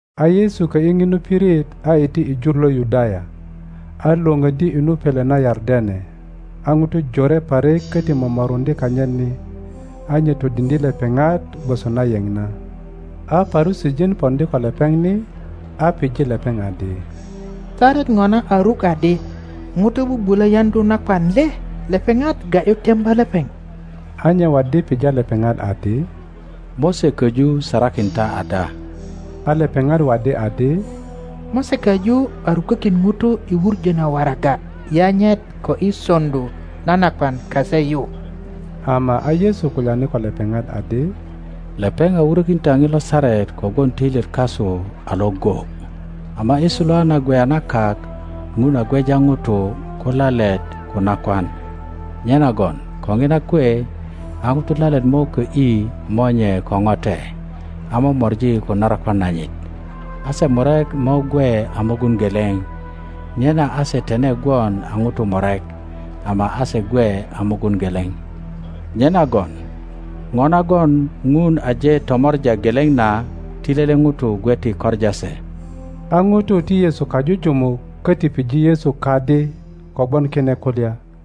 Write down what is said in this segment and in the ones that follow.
A Yesu kö ’yi ŋinu pirit a iti i jur lo Yudaya, a Iwoŋöddi i nu pele na Yardene, a ŋutu jore parik köti momoruŋdye kanyit ni; a nye todiŋdye lepeŋat gwoso na yeŋ na. A Parusijin poŋdi ko lepeŋ ni a pije lepeŋ adi, Saret ŋona a ruk adi ŋuto bubulö yaŋdu nakwan le? Lepeŋat ga ’yu temba lepeŋ. A nye waddi pija lepeŋat adi, Mose köju sarakin ta ada? A lepeŋat waddi adi, Mose köju a rukökin ŋuto i wuŋö na waraga yanyet ko i soŋdu na nakwan kase yu. Ama a Yesu kulyani ko lepeŋat adi, Lepeŋ a wurökin ta ŋilo saret kogwon töilyet kasu a iŋgo. Ama i suluwa na gweya na kak Ŋun a gweja ŋutu ko lalet ko nakwan. Nyenagon ko ŋina kwe a ŋuto lalet mo kö ’yi monye ko ŋote a mo mori ko narakwan nanyit, a se murek mo gwe a mugun geleŋ. Nyena a se tine gwon a ŋutu murek ama a se gwe a mugun geleŋ. Nyenagon ŋo nagon Ŋun aje tomor a geleŋ na ti lele ŋuto gwe ti koŋa se. A ŋutu ti Yesu kajujumuk köti pije Yesu kadi kogwon kine kulya.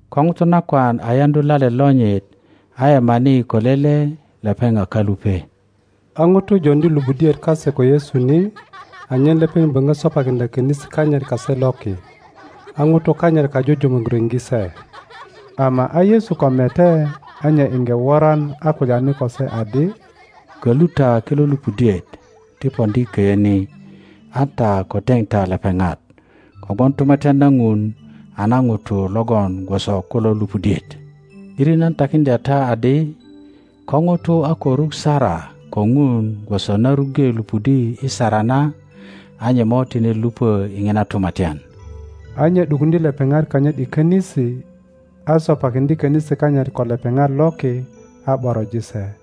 Ko ŋuto nakwan a yaŋdu lalet lonyit a yemani ko lele, lepeŋ a kalupe. A ŋutu joŋdi lupudiet kase ko Yesu ni anyen lepeŋ böŋö sopakiŋdya könisi kanyit kase loki; a ŋutu kanyit kajujumuk riŋge se. Ama a Yesu ko mete, a nye iŋge woran a kulyani ko se adi, Kölu ta kilo lupudiet ti poŋdi köyö ni, an ta ko teŋ ta lepeŋat; kogwon Tumatyan na Ŋun a na ŋutu logon gwoso kulo lupudiet. ’Diri nan takiŋdya ta adi, Ko ŋuto a ko ruk sara ko Ŋun gwoso na ruŋge lupudi i sara na, a nye mo tine lupö i ŋina tumatyan. A nye ’dukuŋdye lepeŋat kanyit i könisi, a sopakiŋdye könisi kanyit ko lepeŋat loki a ’boroji se.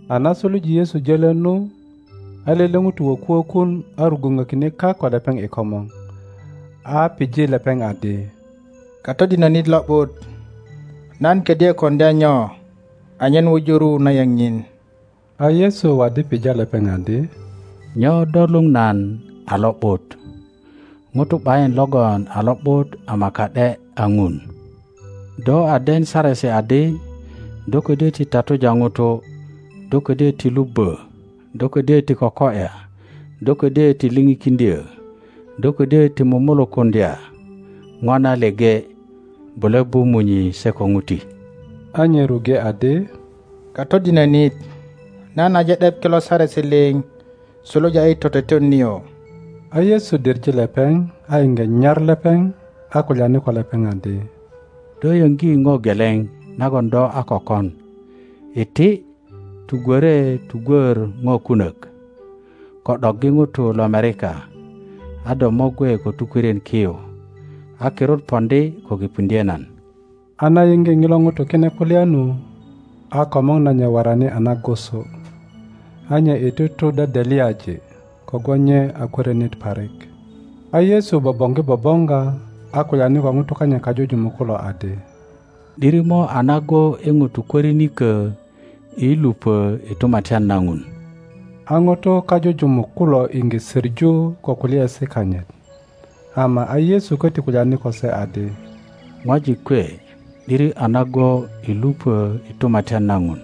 A na suluje Yesu jölö nu, a lele ŋuto woku wokun, a rugwuŋökine kak ko lepeŋ i komor, a pije lepeŋ adi, Katodinönit lo ’but, nan ködyö koŋdya nyo anyen wuju ru na yeŋ nyin? A Yesu waddi pija lepeŋ adi, Nyo do luŋ nan a lo ’but? ŋuto ’bayin logon a lo ’but ama ka ’de a Ŋun. Do a den saresi adi, Do ködyö ti tatuja ŋutu; Do kodyö ti lubbö; Do ködyö ti koko ’ya; Do ködyö ti lipikiŋdyö; Do ködyö ti mumulukuŋdya ŋo na leŋe; Bule bu munyi se ko ŋuti. a nye ruŋge adi, Katodinönit, nan aje ’dep kilo saresi liŋ suluja i toteton nio. A Yesu diŋe lepeŋ, a iŋge nyar lepeŋ, a kulyani ko lepeŋ adi, Do yöŋgi ŋo geleŋ nagon do a ko kon; iti, tugwöre tugwör ŋo kunök, ko ’doggi ŋutu lomerika, a do mo gwe ko tukwörien ki yu, a kirut poŋdi ko kipuŋdye nan. A na yiŋge ŋilo ŋuto kine kulya nu, a komor nanyit worani a nagusu, a nye iti tu dedelyaji, kogwon nye a kwörinit parik. A Yesu boboŋgi bo boŋga, a kulyani ko ŋutu kanyit kajujumuk kulo adi, ’Diri mo a nago i ŋutu kwörinikö i lupö i Tumatyan na Ŋun. A ŋutu kajujumuk kulo iŋge soŋu ko kulyaesi kanyit. Ama a Yesu köti kulyani ko se adi, ŋwajik kwe, ’diri a nago i lupö i Tumatyan na Ŋun!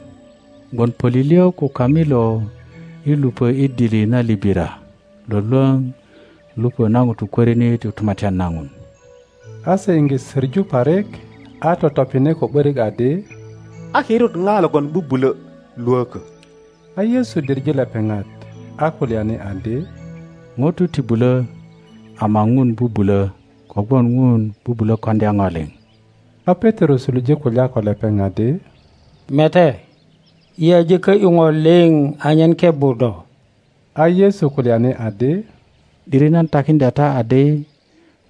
Gwon pölilyö ko kamilo i lupö i dili na libira lwölwöŋ lupö na ŋuto kwörinit i Tumatyan na Ŋun. a se iŋge söŋu parik, a totopine ko ’börik adi, A kirut ŋa logon bubulö lwökö? a Yesu diŋe lepeŋat, a kulyani adi, ŋutu ti bulo, ama Ŋun bubulö; kogwon Ŋun bubulo koŋdya ŋo liŋ. A Petero suluje kulya ko lepeŋ adi, Mete, yi aje kö ’yu ŋo liŋ anyen kebbu do. A Yesu kulyani adi, ’Diri nan takiŋdya ta adi,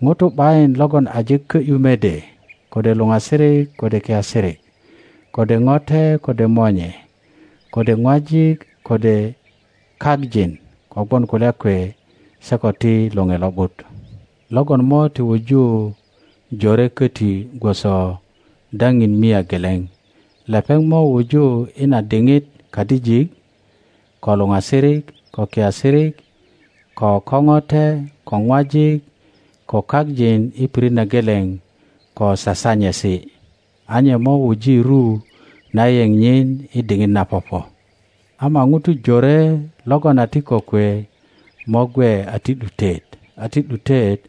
ŋuto ’bayin logon aje kö ’yu mede, kode luŋasirik, kode kiasirik, kode ŋote, kode monye, kode ŋwajik, kode kak jin, kogwon kulya kwe se ko ti Loŋe Lo ’but, logon mo ti wuju jore koti gwoso daŋin mia geleŋ. Lepeŋ mo wuju i na diŋit kadijik, ko luŋasirik, ko kiasirik, ko ko ŋote, ko ŋwajik, ko kak jin, i pirit na geleŋ ko sasanyesi; a nye mo wuji ru na yeŋ nyin i diŋit na popo. Ama ŋutu jore logon a ti kokwe mo gwe a ti ’dutet, a ti ’dutet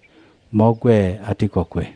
mo gwe a ti kokwe.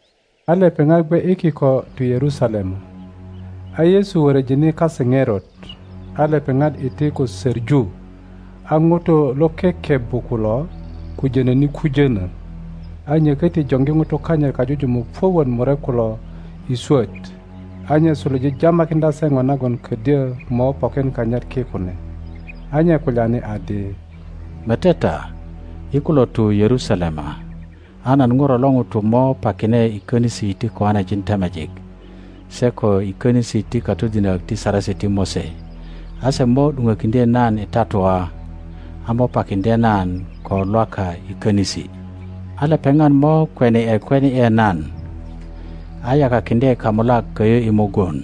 A lepeŋat gwe i kiko tu Yerusalema, a Yesu wöröjine kase ŋerot; a lepeŋat iti ko söŋu, a ŋutu lo kekebbu kulo kujonöni kujöno. A nye köti joŋgi ŋutu kanyit kajujumuk puök wot murek kulo i swöt, a nye suluje jamakiŋdya se ŋo nagon ködyö mo pokin kanyit ki kune. a nye kulyani adi. Mete ta, yi kulo tu Yerusalema, a nan Ŋuro lo ŋuto mo pakine i konisi ti koanejin temejik se ko i konisi ti katodinök ti Saresi ti Mose. A se mo ’duŋökiŋdye nan i tatua, a mo pakiŋdye nan ko Lwaka i konisi. a lepeŋat mo kweni ’e kweni ’e nan, a yakakiŋdye kamulak köyö i mugun,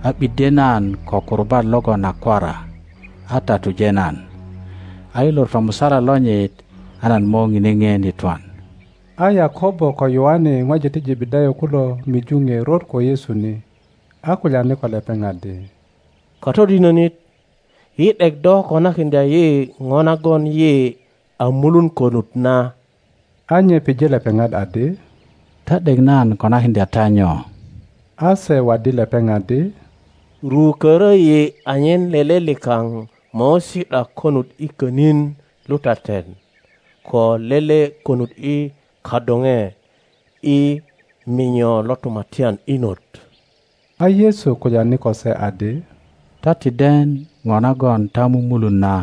a ’biddye nan ko kurubat logon a kwara, a tatuje nan. A i lor tomusala lonyit a nan mo ŋine ŋien i twan. A Yakobo ko Yoane ŋwajik ti Jebedayo kulo miju ŋerot ko Yesu ni, a kulyani ko lepeŋ adi, Katodinonit, yi ’dek do konakiŋdya yi ŋo nagon yi a mulun konut na. a nye pije lepeŋat adi, Ta ’dek nan konakiŋdya ta nyo? A se waddi lepeŋ adi, Rukoro yi anyen lele likaŋ mo si ’da konut i könin lutaten ko lele konut i kadoŋe i minyo lo tumatyan inot. a Yesu kulyani ko se adi, Ta ti den ŋo nagon ta mumulun na;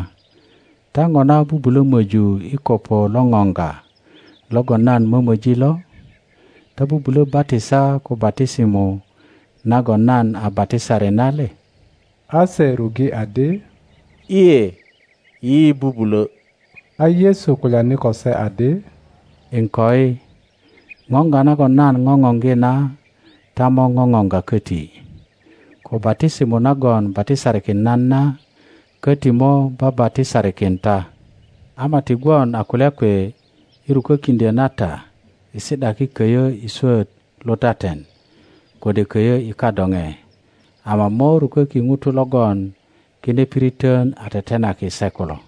ta ŋona bubulo möju i kopo lo ŋoŋga logon nan momoji lo? Ta bubulo batisa ko batisimo nagon nan a batisari na le? A se rupe adi, lye, yi bubulo. A Yesu kulyani ko se adi, Iŋkoi, ŋoŋga nagon nan goŋoŋgi na ta mo ŋoŋoga koti, ko batisimo nagon batisarikin nan na koti mo babatisarikin ta; ama ti gwon a kulya kwe i rukökiŋdyo na ta i si ’daki köyö i swöt lutaten kode koyo i kadoŋe, ama mo ruköki ŋutu logon kine piriton a tetenaki se kulo.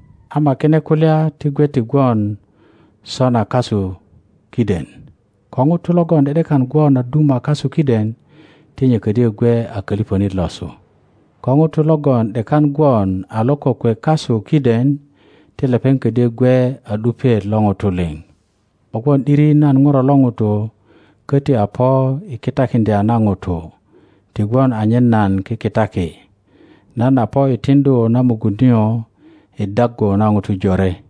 Ama kine kulya ti gwe ti gwon sona kasu kiden; ko ŋuto logon ’de ’dekan gwon a duma kasu kiden, ti nye ködyö gwe a koliponit losu, ko ŋuto logon ’dekan gwon a lo kokwe kasu kiden, ti lepeŋ ködyö gwe a ’dupiet lo ŋutu liŋ. Kogwon ’diri nan Ŋuro lo ŋuto köti a po i kitakiŋdya na ŋutu ti gwon anyen nan kikitaki; nan a po i tiŋdu na mugun nio i daggu na ŋutu jore.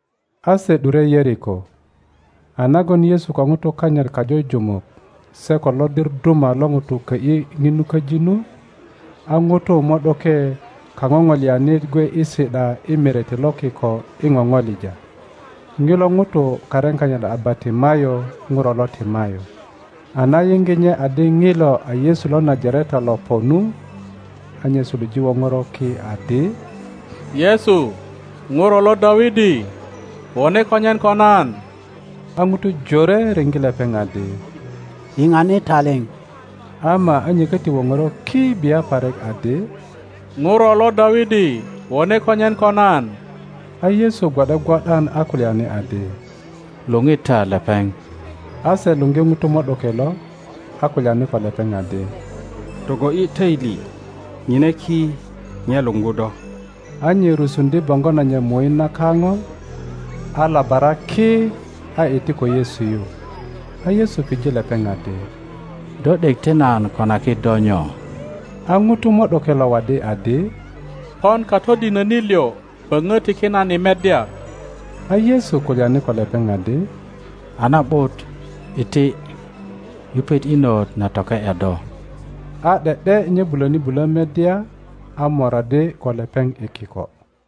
A se ’dure Yeriko. A nagon Yesu ko ŋutu kanyit kajujumuk se ko lodir duma lo ŋutu kö ’yi ŋinu köji nu, a ŋuto mo ’doke kaŋoŋolianit gwe i si ’da i merete lo kiko i ŋoŋolija. Ŋilo ŋuto karin kanyit a Bartimayo ŋuro lo Timayo. a na yiŋge nye adi ŋilo a Yesu lo Najareta lo po nu, a nye suluje woŋoro ki adi, Yesu! Ŋuro lo Dawidi! Wone konyen ko nan! a ŋutu jore riŋge lepeŋ adi, Yiŋani taliŋ! Ama a nye köti woŋoro ki bia parik adi, Ŋuro lo Dawidi, wone konyen ko nan! a Yesu gwo ’de gwo ’dan a kulyani adi, Luŋi ta lepeŋ. A se luggi ŋuto mo ’doke lo, a kulyani ko lepeŋ adi, Togo ’yi töili; ŋine ki, nye luŋgu do. A nye rusuŋdye boŋgo nanyit muit na kaŋo, a labara ki, a iti ko Yesu yu. A Yesu pije lepeŋ adi, Do ’dek ti nan konaki do nyo? A ŋuto mo ’doke lo waddi adi, Pon Katodinönit liŋ, böŋö tiki nan i meddya. a Yesu kulyani ko lepeŋ adi, A na ’but, iti, yupet inot na toke ’ya do. A ’de ’de nye buloni bulö meddya, a moraddi ko lepeŋ i kiko.